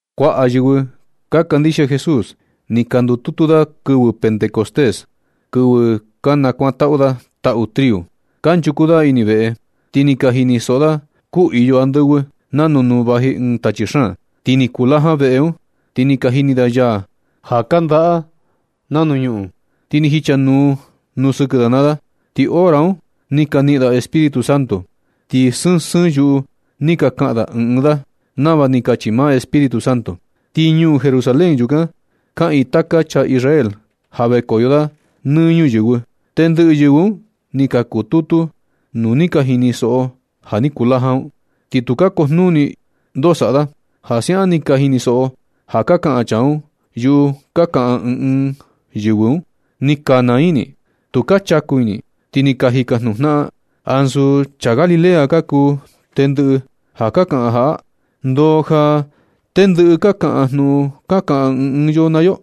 Kuaꞌa yɨvɨ ka kandixia Jesús, ni ka ndututu da kɨvɨ Pentecostés, kɨvɨ ka nakuaꞌa da taꞌu triu. Kanchuku da ini veꞌe, ti ni ka jinisoꞌo da kuu iyo andɨvɨ, nanu nuu vaji ɨɨn tachi xaan. Ti ni kulajan veꞌe un. Ti ni ka jini da yaa ja kandaꞌa nuu ñuꞌun, ti ni jicha nuu sɨkɨ da naa da. Ti hora un ni ka niꞌin da Espíritu Santo, ti sɨɨn sɨɨn yuꞌu ni ka kaꞌan ɨɨn ɨɨn da, nava ni kachi maa Espíritu Santo. Ti ñuu Jerusalén yukan, kaꞌiin taka chaa Israel ja vekoyo da nɨ ñuyɨvɨ. Tendɨꞌɨ yɨvɨ un ni ka kututu nu ni ka jinisoꞌo ja ni kulajan un, ti tu ka kujnuni ndoo saꞌa, ja siaꞌan ni ka jinisoꞌo ja ka kaꞌan chaa un yuꞌu ka kaꞌan ɨɨn ɨɨn yɨvɨ un. Ni ka naa ini, tu ka chaku ini, ti ni ka jikajnuꞌun jnaꞌan: ―¿Ansu chaa Galilea ka kuu tendɨꞌɨ ja ka kaꞌan jaꞌa? ¿Ndoo ja ni ndɨꞌɨ ka kaꞌan jnuꞌun ka kaꞌan ɨɨn ɨɨn yo naa yo?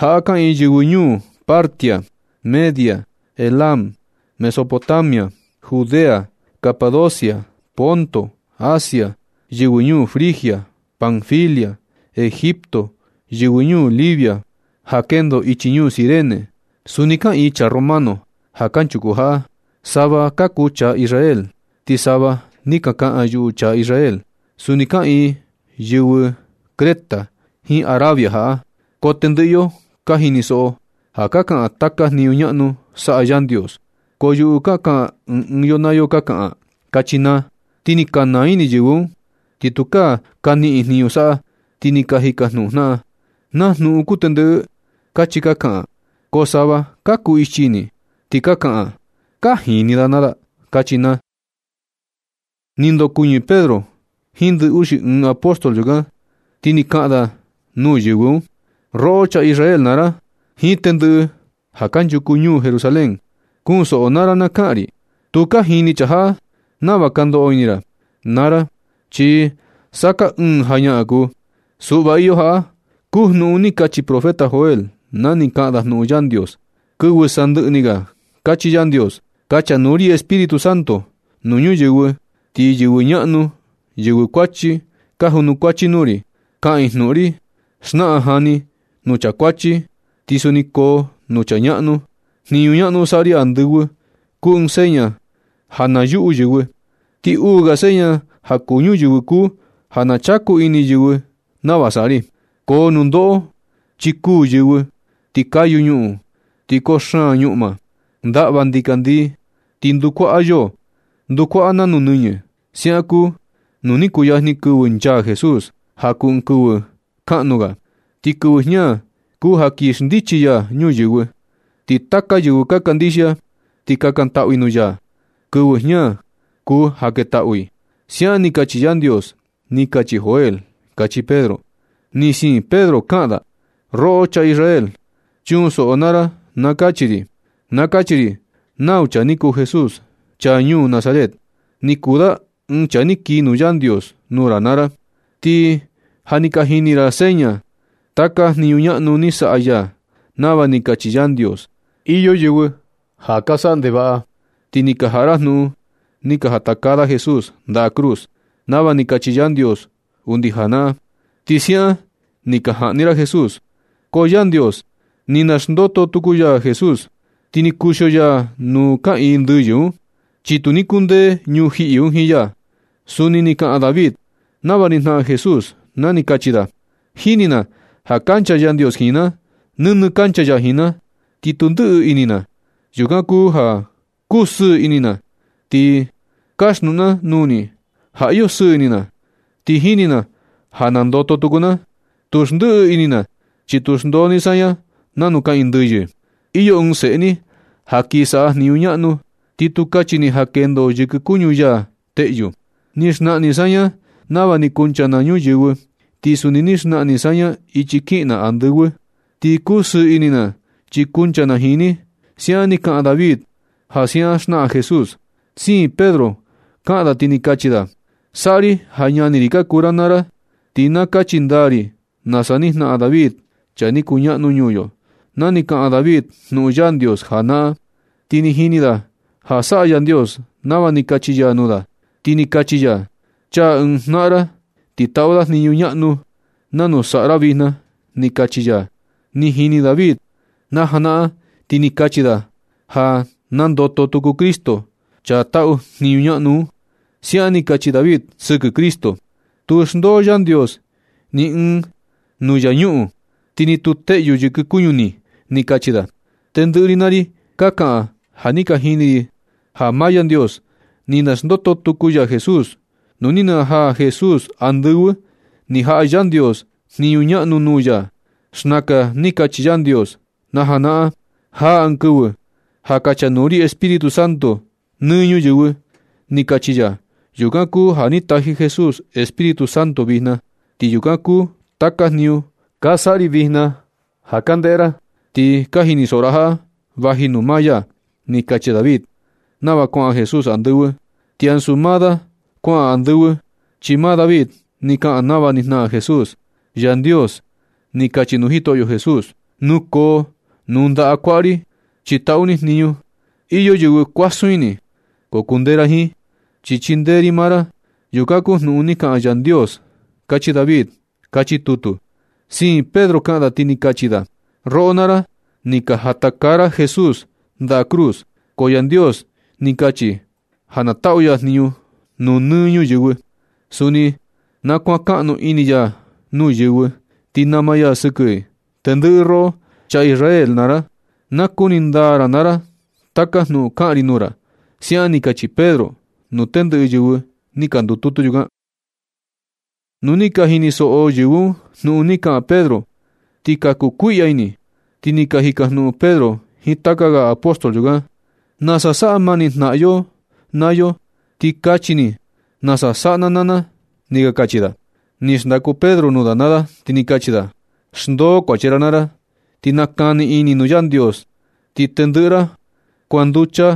Jaꞌa kaꞌiin yɨvɨ ñuu Partia, Media, Elam, Mesopotamia, Judea, Capadocia, Ponto, Asia, yɨvɨ ñuu Frigia, Panfilia, Egipto, yɨvɨ ñuu Lybia, ja kendo chii ñuu Cirene. Suni kaꞌiin chaa romano ja kanchuku jaꞌa; sava ka kuu chaa Israel, ti sava ni ka kaꞌan yuꞌu chaa Israel. Suni kaꞌiin yɨvɨ Creta jiin Arabia jaꞌa, ko tɨndɨꞌɨ yo ka jinisoꞌo ja ka kaꞌan taka jniñu ñaꞌnu saꞌa Yandios, ko yuꞌu ka kaꞌan ɨɨn ɨɨn yo naa yo ka kaꞌan ―kachi naa. Ni ka naa ini yɨvɨ un, ti tu ka niꞌin jniñu saꞌa, ti ka jikajnuꞌun jnaꞌan: ―¿Na jnuꞌun kuu ndɨꞌɨ? ―kachi ka kaꞌan. Ko sava ka kuu ichi ini, ti ka kaꞌan: ―Ka jini da naa da ―kachi naa. Ni ndokuɨñɨ Pedro jiin ndɨꞌɨ uxi ɨɨn apóstol yukan, ti ni kaꞌan da nuu yɨvɨ un: ―Roꞌo chaa Israel naa ra, jiin tɨndɨꞌɨ ja kanchuku ñuu Jerusalén. Kunsoꞌo ra naa ra na kaꞌan ri. Tu ka jini chaa jaꞌa nava ka ndoꞌo ini ra naa ra, chi sa kaa ɨɨ̄n jañaꞌan kuu. Suꞌva iyo, jaꞌa kuu jnuꞌun ni kachi profeta Joel na ni kaꞌan da jnuꞌun Yandios: Kɨvɨ sandɨꞌɨ ni ga kachi Yandios: Kachanuu ri Espíritu Santo nɨ ñuyɨvɨ, ti yɨvɨ ñaꞌnu yɨvɨ kuachi ka junukuachi nuu ri, kaꞌan i jnuꞌun ri. Naxnaꞌan jani nuu chaa kuachi, ti suni koo nuu chaa ñaꞌnu. Jniñu ñaꞌnu saꞌa ri andɨvɨ, kuu ɨɨn seña ja na yuꞌu yɨvɨ. Ti uu ga seña ja kuu ñuyɨvɨ kuu ja na chaku ini yɨvɨ nava saꞌa ri. Koo nundoꞌo, chi kuū yɨvɨ, ti kayu ñuꞌun, ti koo xaan ñuꞌma. Ndaꞌva ndikandii ti ndukuaꞌa yoo. Ndukuaꞌa nanu nɨñɨ. Siaꞌan kuu nu ni kuyajni kɨvɨ nchaa Jesús, ja kuu ɨɨn kɨvɨ kaꞌnu ga. Ti kɨvɨ jña kuu ja kii xndichi ya ñuyɨvɨ. Ti taka yɨvɨ ka kandixia, ti kakantaꞌu i nuu ya, kɨvɨ jña kuu ja ketaꞌu i. Siaꞌan ni kachi Yandios, ni kachi Joel ―kachi Pedro. Ni siin Pedro kaꞌan da: ―Roꞌo chaa Israel, chunsoꞌo naa ra na kachi ri. Na kachi ri nau chaa ni kuu Jesús, chaa ñuu Nazaret. Ni kuu da ɨɨn chaa ni kii nuu Yandios nuu ra naa ra. Ti ja ni ka jini ra seña, taka jniñu ñaꞌnu ni saꞌa ya, nava ni kachi Yandios. Iyo yɨvɨ ja ka saꞌa ndevaꞌa, ti ni ka jaꞌa ra jnuꞌun ni ka jatakaa da Jesús ndaꞌa cruz, nava ni kachi Yandios undi janaꞌan. Ti siaꞌan ni ni ka jaꞌni ra Jesús. Ko Yandios ni naxndoto tuku ya Jesús, ti ni kuxio ya nuu kaꞌiin ndɨyɨ un, chi tu ni kundee ñujiꞌi un jiin ya. Suni ni kaꞌan David nava ni jnaꞌan Jesús na ni kachi da: Jini na ja kancha Yandios jiin na. Nɨnɨ kancha ya jiin na. Ti tu ndɨꞌɨ ini na. Yukan kuu ja kuu sɨɨ ini na. Ti kaxnuꞌun na nuu ni ja iyo sɨɨ ini na. Ti jini na ja nandoto tuku na. Tu ndɨꞌɨ ini na, chi tu xndoo ni saña nanu kaꞌiin ndɨyɨ. Iyo ɨɨn seꞌe ni ja kin saꞌa jniñu ñaꞌnu, ti tu kachi ni ja kendo yɨkɨ kuñu ya teꞌyu. Ni xnaꞌan ni saña nava ni kuncha na ñuyɨvɨ, ti suni ni xnaꞌan ni saña ichi kiꞌin na andɨvɨ. Ti kusɨɨ ini na chi kuncha na jiin ni. Siaꞌan ni kaꞌan David ja siaꞌan jnaꞌan Jesús. Siin Pedro kaꞌan da, ti ni kachi da: ―Saꞌa ri ja ñani ri ka kuu ra naa ra, ti na kachi ndaa ri nasa ni jnaꞌan David, chaa ni kuñaꞌnu ñuu yo, na ni kaꞌan David jnuꞌun Yandios najanaꞌan. Ti ni jini da ja saꞌa Yandios nava ni kachi ya nuu da, chi ni kachi ya: “Chaa ɨɨn jnaꞌan ra, ti taꞌu da jniñu ñaꞌnu nanu saꞌa ra vijna”, ni kachi ya. Ni jini David najanaꞌan ti ni kachi da ja nandoto tuku Cristo, chaa taꞌu jniñu ñaꞌnu un. Siaꞌan ni kachi David sɨkɨ Cristo: “Tu xndoo Yandios niꞌin nuu infiernu, ti ni tu teꞌyu yɨkɨ kuñu ni”, ni kachi da. Tendɨꞌɨ ri naa ri ka kaꞌan ja ni ka jini ri ja maa Yandios ni naxndoto tuku ya Jesús. Nu ni najaa Jesús andɨvɨ, ni jaꞌa Yandios jniñu ñaꞌnu nuu ya. Xnaka ni kachi Yandios najanaꞌan: “Jaa ɨɨn kɨvɨ ja kachanuu ri Espíritu Santo nɨ ñuyɨvɨ”, ni kachi ya. Yukan kuu ja ni taji Jesús Espíritu Santo vijna. Ti yukan kuu taka jniñu ka saꞌa ri vijna ja ka ndeꞌe ra, ti ka jinisoꞌo ra jaꞌa vaji nuu maa ya. Ni kachi David nava kuaꞌan Jesús andɨvɨ, chi ansu maa da kuaꞌan andɨvɨ. Chi maa David ni kaꞌan nava ni jnaꞌan Jesús: Yandios ni kachi nuu Jitoꞌyo Jesús: “Nukoo nuu ndaꞌa kuaꞌa ri, chi taꞌu ni jniñu. Iyo yɨvɨ kuasun ini, ko kundee ra jiin, chi chindee ri maa ra.” Yukan kuu jnuꞌun ni kaꞌan Yandios, kachi David. Kachi tutu. Siin Pedro kaꞌan da, ti ni kachi da: ―Roꞌo naa ra, ni ka jatakaa ra Jesús nda cruz, ko Yandios ni kachi ja na taꞌu ya jniñu nuu nɨ ñuyɨvɨ. Suni na kuankaꞌnu ini ya nuu yɨvɨ, ti nama ya sɨkɨ i. Tendɨꞌɨ roꞌo, chaa Israel naa ra, na kuni ndaa ra naa ra taka jnuꞌun kaꞌan ri nuu ra ―siaꞌan ni kachi Pedro nuu tendɨꞌɨ yɨvɨ ni ka ndututu yukan. Nu ni ka jinisoꞌo yɨvɨ un jnuꞌun ni kaꞌan Pedro, ni ka kukuiꞌya ini, ti ni ka jikajnuꞌun Pedro jiin taka ga apóstol yukan: ―Na saꞌa mani jnaꞌan yo naa yo, ti kachi ni nasa saꞌa na naa na ―ni ka kachi da. Ni xndaku Pedro nuu da naa da, ti ni kachi da: ―Xndoo kuachi ra naa ra, ti nakani ini nuu Yandios, ti tendɨꞌɨ ra kuanducha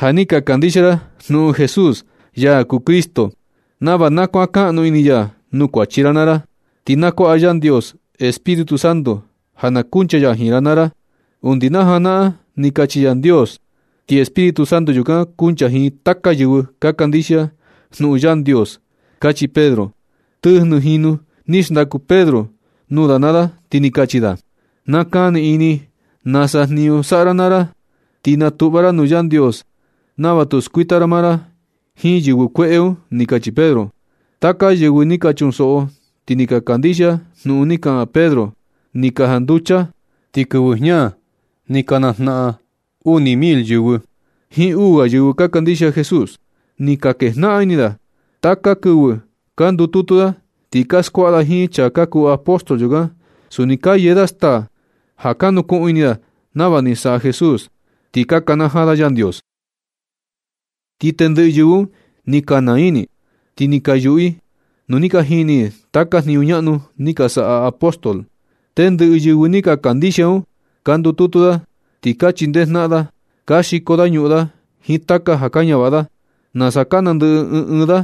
ja ni ka kandixia ra jnuꞌun Jesús, ya kuu Cristo, nava na kuankaꞌnu ini ya nuu kuachi ra naa ra. Ti na kuaꞌa Yandios Espíritu Santo ja na kuncha ya jiin ra naa ra. Undi na janaꞌan ni kachi Yandios. Ti Espíritu Santo yukan kuncha jiin taka yɨvɨ ka kandixia jnuꞌun Yandios ―kachi Pedro. Tɨjnɨ jinu ni xndaku Pedro nuu da naa da, ti ni kachi da: ―Kani ini nasa jniñu saꞌa ra naa ra, ti natuꞌva ra nuu Yandios nava tu skuita ra maa ra jiin yɨvɨ kueꞌe un ―ni kachi Pedro. Taka yɨvɨ ni ka chunsoꞌo, ti ni ka kandixia jnuꞌun ni kaꞌan Pedro, ni ka janducha. Ti kɨvɨ jña ni ka najnaꞌan uni mil yɨvɨ un jiin uu ga yɨvɨ ka kandixia Jesús. Ni ka kejnaꞌan ini da. Taka kɨvɨ ka ndututu da. Ti ka skuaꞌa da jiin chaa ka kuu apóstol yukan. Suni ka yee da staa ja ka nukuꞌun ini da nava ni saꞌa Jesús, ti ka nakanajaa da Yandios. Ti tendɨꞌɨ yɨvɨ un ni ka naa ini, ti ni ka yuꞌu i nuu ni ka jini i taka jniñu ñaꞌnu ni ka saꞌa apóstol. Tendɨꞌɨ yɨvɨ ni ka kandixia un ka ndututu da, ti ka chindee jnaꞌan da. Ka xiko da ñuꞌun da jiin taka ja ka ñavaꞌa da, nasa ka nandɨꞌɨ ɨɨn ɨɨn da.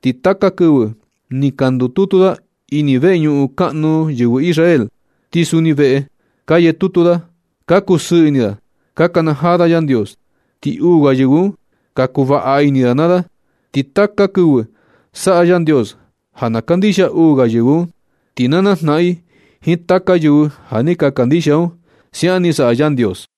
Ti taka kɨvɨ ni ka ndututu da ini veñuꞌun kaꞌnu yɨvɨ Israel. Ti suni veꞌe, ka yee tutu da. Ka kusɨɨ ini da. Ka nakanajaa da Yandios, ti uu ga yɨvɨ un ka kuvaꞌa ini nuu da naa da. Ti taka kɨvɨ saꞌa Yandios ja na kandixia uu ga yɨvɨ un, ti na najnaꞌan i jiin taka yɨvɨ ja ni ka kandixia un. Siaꞌan ni saꞌa Yandios.